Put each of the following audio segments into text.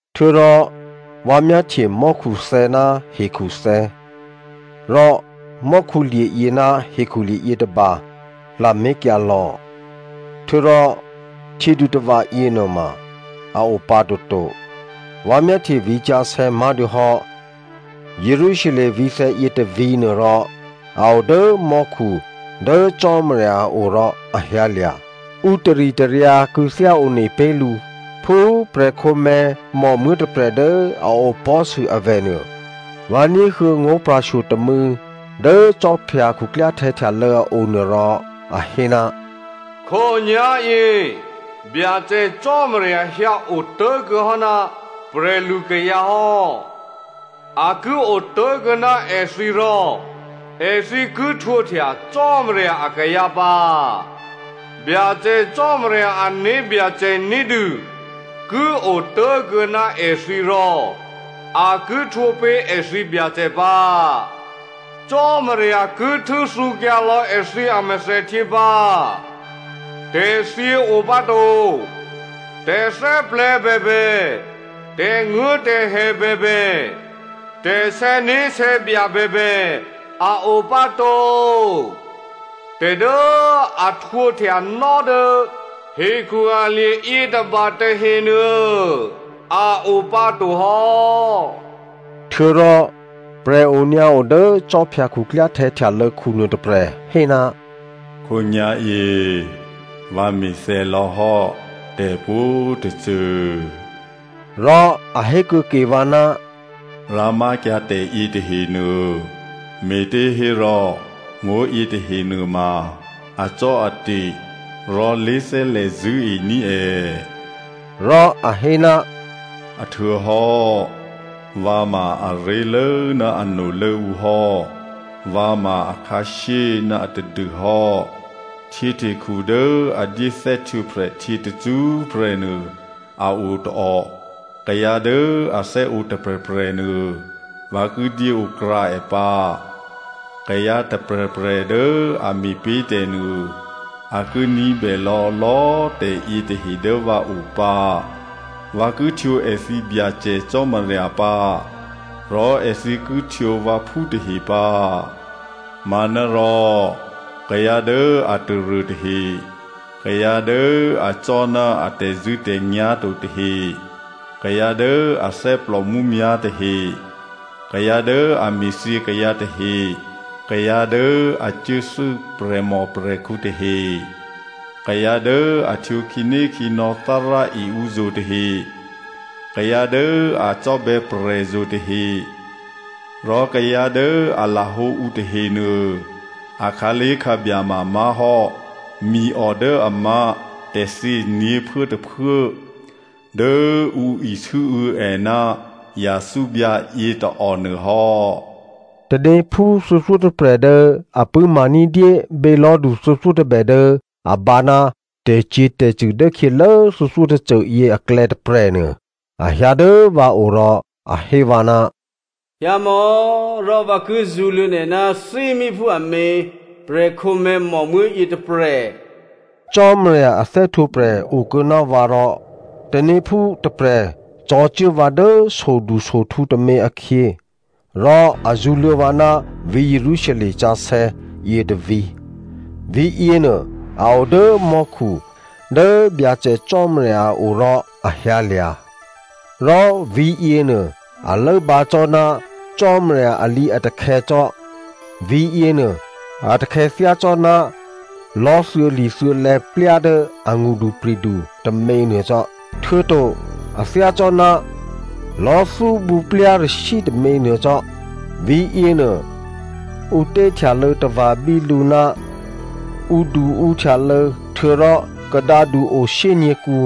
Htuô̌rò vǎ myáhtye mò́khuthè̌ ná hekhuthè̌. Rò mò́khulye̤yě ná hekhulye̤ yětôba lamé̤kyǎ lò̌. Htuô̌rò htyědutava̤ yěnuôma a opǎ toto. Vǎ myáhtye vǐ̤sǎsè̌ má̤dûhò́ Jerusalem vǐ̤thè̌ yětôvǐ̤ nuô, rò a o dố mò́khu dố Cò́marya a o rò a hyǎlya̤. Ǔ taritaryǎ kû̌thyá one pé̤ lǔ phú prè̤khǒmè̤̌ mòmuố̤ tôprè̤ dố a opò̤́sû avè̤ nuô. Vǎ ní̤huô̌ ngó̤pra̤shyo tômû̌ dố khwí khuklyáhtè̌ htyalô̌ a onuô, rò a hé, “Khǒnyá̤yě Byacè Cò́marya hyǎotố̤kuô̌ hò́ ná prè̤lukayǎ hò́. A ki otố̤kuô̌ ná èthǐ rò èthǐ ki htwǒhtya Cò́marya akayǎ pǎ. Byacè Cò́marya ané̤byacè ní̤dû ki otố̤kuô̌ ná èthǐ rò a ki htwǒ pé̤ èthǐ Byacè pǎ. Cò́marya ki htû́thǔkyǎ lò̌ èthǐ amèthèhtyě pǎ. Tè̤thyě o pǎ to. Tè̤thè́plè̤̌ bèbè, tè̤nguố̤tè̤hè bèbè, tè̤sè̌né̤sè̌bya bèbè a o pǎ to. Tè̤ dố a htwǒhtyanò́ dố hekhu alye̤ yětôba tahenuô, a o pǎ to hò́.” Htuô̌rò prè̤ onyǎo dố khwí khuklyáhtè̌ htyalô̌khu nuôtôprè̤ hé, “Khǒnyá̤yě vǎ me̤thè̌ lò̌hò́ tè̤pwǒ̤tôcô.” Rò a hé kuô̌ ke vǎ, “Rǎmákyǎ tè̤ yětahenuô, me̤těhérò ngó̤yě tahe nuôma acò́ate̤ rò lé̤thè́lè̤ zṳ̂́ení̤ è.” Rò a hé, “A htuô̌hò́, vǎ ma aré̤lố ná anolố ǔ hò́. Vǎ ma akhǎshyé ná atadû hò́. Htyěhtekhu dố a dyé thè́htwǒprè̤htyě tacṳ́prè̤ nuô a o tôò. Kayǎ dố a thè́ǒ tôprè̤prè̤ nuô, vǎ ki dyéǒkrǎ è pǎ. Kayǎ tôprè̤prè̤ dố a me̤pé̤ tè̤nuô, a ki ní̤bè lò̌lò̌꤮ tè̤yě tahe dố vǎo pǎ. Vǎ ki htwǒ èthǐ Byacè Cò́marya pǎ rò èthǐ ki htwǒ vǎphú tahe pǎ. Manárò kayǎ dố a taruô tahe, kayǎ dố acò́ ná a tè̤zṳ̂́tè̤nyá̤ to tahe, kayǎ dố athè́plò mǔmyá̤ tahe, kayǎ dố a me̤thyě kayǎ tahe, kayǎ dố a cuốthû́ prè̤mòprè̤khǔ tahe, kayǎ dố a htwǒ khǐnékhǐnò̌ Thárá e ǔzo̤ tahe, kayǎ dố a cò́bè̌ prè̤zo̤ tahe, rò kayǎ dố a lahǒ ǔ tahenuô akhǎlé̤khǎbya mamá̤hò́ miò dố a má̤ tè̤thyě nyě̤phuốtôphuố dố ǔ isû́û̌ è ná yathúbyǎ yětôò nuô hò́.” Tanéphú thuô̌thyótôprè̤ dố a pṳ̂́ma ní̤dyé bělò̤́du thuô̌thyótôbè dố a bǎ ná tè̤cyě̤tè̤cṳ̂ dốkhyělố thuô̌thyótôcô yě aklè̌ tôprè̤nuô, a hyǎ dố vǎ o rò a hé vǎ, “Hyǎmò̌ rò vǎ ki zṳ̌luô̌ nè̤ ná thímíphú amě prè̤khǒmè̤̌ mòmuố̤ yětôprè̤.” Cò́marya a thè́htwǒprè̤ okuô̌ ná vǎ rò tanéphú tôprè̤ cò̤̌cuố vǎ dố sodusohtǔ tômě akhyě. Rò a zṳ̌luô̌ vǎ ná vǐ̤ Jerusalem sǎsè̌ yětôvǐ̤. Vǐ̤yěnuô a o dố mò́khu dố Byacè Cò́marya a o rò a hyǎlya̤. Rò vǐ̤yěnuô, a lốbǎ cò́ ná Cò́marya alǐatakhè̌ cò́. Vǐ̤yěnuô, a takhè̌ thyácò́ná lò̤́ thuô̌li̤thuô̌lè̌plya dố angṳdupri̤du tôměnuô cò́, htuô̌to a thyácò́ná lò̤́thúbǔ plyarashyǐ tômě nuô cò́. Vǐ̤yěnuô ǔ té htyalô̌ tava̤ bí lǔ ná ǔduǔhtyalô̌. Htuô̌rò kadǎdu o shyényě̤kǔ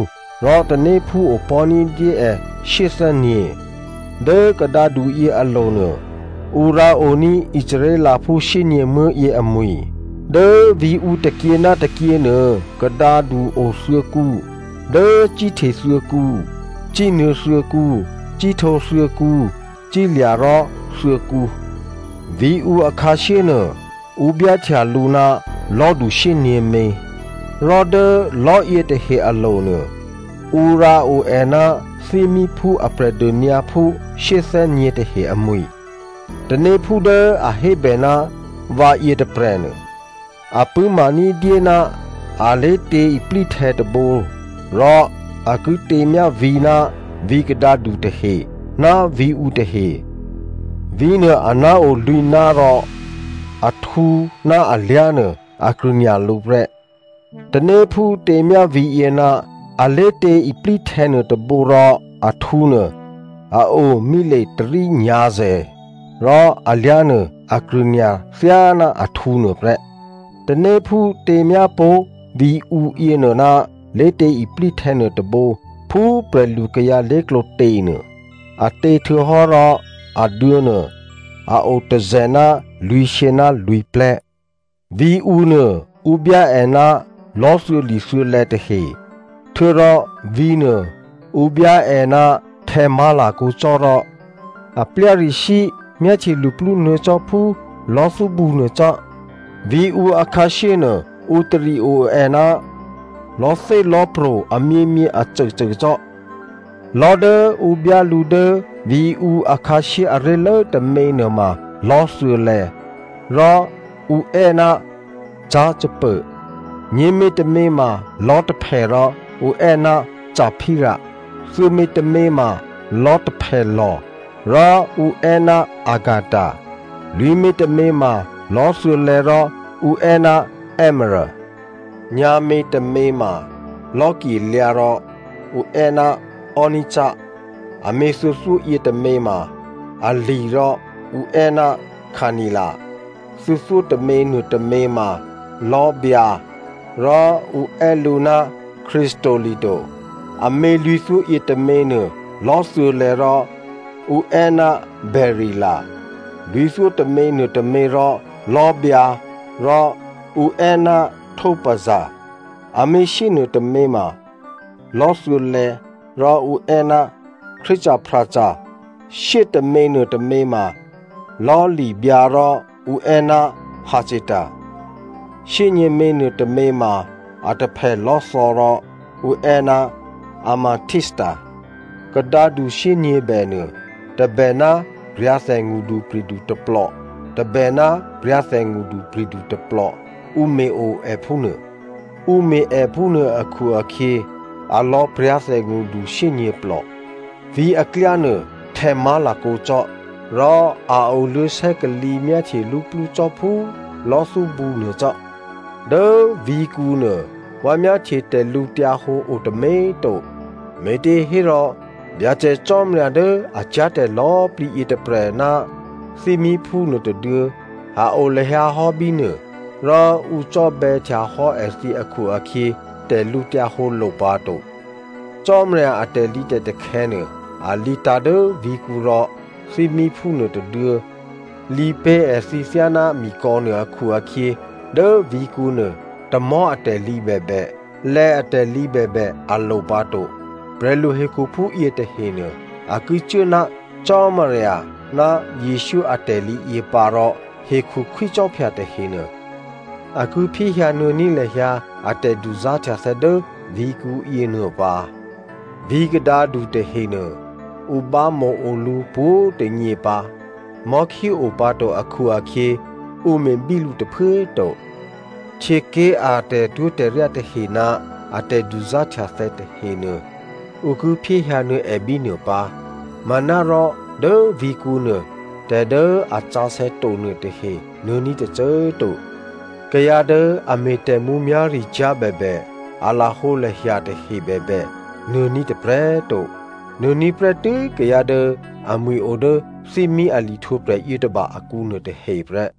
rò tanéphú opò̤́ ní̤dyé è shyéthè́nyě̤. Dố kadǎduyě alo̤ nuô ǔ rǎoní̤ Israelphú shyényě̤muố̤ yě amwi̤. Dố vǐ̤ǔ tôkyě ná tôkyě nuô kadǎdu othuô̌kǔ. Dố cíhte thuô̌kǔ, cínuô̌ thuô̌kǔ, cíhtǒ thuô̌kǔ, cílya̤ rò thuô̌kǔ. Vǐ̤ǔ akhǎshyé nuô ǔ byáhtya lǔ ná lò̤́du shyěnyě̤mě. Rò dố lò̤́ yětahe alo̤ nuô ǔ rǎo è ná thímíphú a Prè̤dônyǎphú shyéthè́nyě̤ tahe amwi̤. Tanéphú dố a hébè ná vǎ yětôprè̤nuô, a pṳ̂́ma ní̤dyé ná alé̤tě iplíhtè̌ tôbǒ rò a ki těmyá vǐ̤ ná vǐ̤kadǎdu tahe ná vǐ̤ǔ tahe. Vǐ̤nuô aná̤ o lwǐ̤ná̤ rò ahtǔ ná alyá̤nuô a krṳ̂nya̤ lǔ prè́. Tanéphú těmyá vǐ̤yě ná alé̤tě iplíhtè̌ nuôtôbǒ rò ahtǔnuô a o mile tôrí nyǎ̤zè̤, rò alyá̤nuô, a krṳ̂nya̤ thyáná ahtǔ nuôprè́. Tanéphú těmyá pó̤ vǐ̤ǔ yěnuô ná lé̤tě iplíhtè̌ nuôtôbǒ phú prè̤lukayǎ lé̤klǒ těnuô. A tě htuô̌hò́ rò aduô̌nuô a o tôzè̤ ná lwǐ̤shyě ná lwǐ̤plè̤́. Vǐ̤ǔ nuô ǔ byá è ná lò̤́thuô̌li̤thuô̌lè̌ tahe htuô̌rò vǐ̤nuô ǔ byá è ná htè̌ má̤lakǒ cò́ rò a plyarashyǐ myáhtye luplú nuô̌ cò́ phú lò̤́thúbǔ nuô cò́. Vǐ̤ǔ akhǎshyé nuô ǔ tari o è ná lò̤́thélò̤́pro̤ amyěmyě acôcô cò́. Lò̤́ dố ǔ byá lǔ dố vǐ̤ǔ akhǎshyé aré̤lố tômě nuôma lò̤́li̤thuô̌lè̌ rò ǔ è́ ná jaspô, nyě̤mětômě ma lò̤́taphè rò ǔ è́ ná saphíra, thuô̌mětômě ma lò̤́taphèlò̤ rò ǔ è́ ná chacéda, lwǐ̤mětômě ma lò̤́thuô̌lè̌ rò ǔ è́ ná èmerô. Nyǎ̤mětômě ma lò̤́kyelyǎ rò ǔ è́ ná sardoni, amě thuô̌thyó yětômě ma ali̤ rò ǔ è́ ná carnila, thuô̌thyótômě nuôtômě ma lò̤́byǎ, rò ǔ è́ lǔ ná khrísolito, amě lwǐ̤thyó yětômě nuô lò̤́thuô̌ rò ǔ è́ ná bèrila, lwǐ̤thyótômě nuôtômě rò lò̤́byǎ rò ǔ è́ ná topaza, amě shyé nuôtômě ma lò̤́thuô̌lè̌ rò ǔ è́ ná khrísoprasa, shyétômě nuôtômě ma lò̤́li̤byǎ rò ǔ è́ ná jacíta, shyényě̤mě nuôtômě ma a taphèlò́thò̌ rò ǔ è́ ná amethísata. Kadǎdu shyényě̤bè nuô tôbè ná pra̤thè ngṳdupri̤du tôplò, tôbè ná pra̤thè ngṳdupri̤du tôplò ǔ me̤ o è phúnuô. Ǔ me̤ è phúnuô akhu-akhyě alò̌ pra̤thè ngṳdu shyényě̤plò. Vǐ̤ aklyá nuô htè̌ má̤lakǒ cò́, rò a oluô̌ sè́kalǐ myáhtye luplú cò́ phú lò̤́thúbǔ nuô cò́. Dố vǐ̤kǔnuô vǎ myáhtye tè̤lǔhǒdu o tômě꤮ to, me̤těhérò Byacè Cò́marya dố a cyá̤tè̤ lò̌꤮ plǐ yětôprè̤ ná thímíphú nuôtôduô̌ a o lahyǎ hò́ bínuô rò ǔ cò́bè̌htya hò́ èthǐ akhu-akhyě, tè̤lǔhǒdu lo pǎto. Cò́marya a tè̤lǐtè̤takhè̌ nuô a lǐtǎ̤ dố vǐ̤kǔ, rò thímíphú nuôtôduô̌ lǐ pé̤ èthǐ thyáná mikò̌nuô akhu-akhyě, dố vǐ̤kǔ nuô tamò̤́ atè̤lǐ bèbè, lè̌ atè̤lǐ bèbè a lo pǎ to. Prè̤lu hekhuphú yětahenuô, a ki cuố ná Cò́marya ná Jesǔ atè̤lǐ yě pǎ rò hekhu khwícò́phya tahenuô a ki phyéhyǎnuô̌ní̤ lahyǎ a tè̤duzá̤htyathè̌ dố vǐ̤kǔ yěnuô pǎ. Vǐ̤ kadǎdu tahenuô ǔ bámǒo lǔ pwǒ̤꤮ tônyě pǎ. Mò̤́khí o pǎ to akhu-akhyě, ǔ me̤bí lǔ tôphuố꤮ to. Htyěké̤ a tè̤twó̤tè̤ryá tahe ná a tè̤duzá̤htyathè̌ tahenuô, ǔ ki phyéhyǎnuô̌ è bínuô pǎ. Manárò dố vǐ̤kǔ nuô tè̤ dố a sǎsè̌ to nuôtahe nuô̌ní̤ tôcô꤮ to. Kayǎ dố a me̤ tè̤mǔmyá̤ricyá̤ bèbè, a lahǒlahya tahe bèbè, nuô̌ní̤ tôprè̤꤮ to. Nuô̌ní̤ prè́tû́ kayǎ dố amwi̤ o dố thímí a lihtwǒprè̤ yětôba akǔ nuôtahe prè́.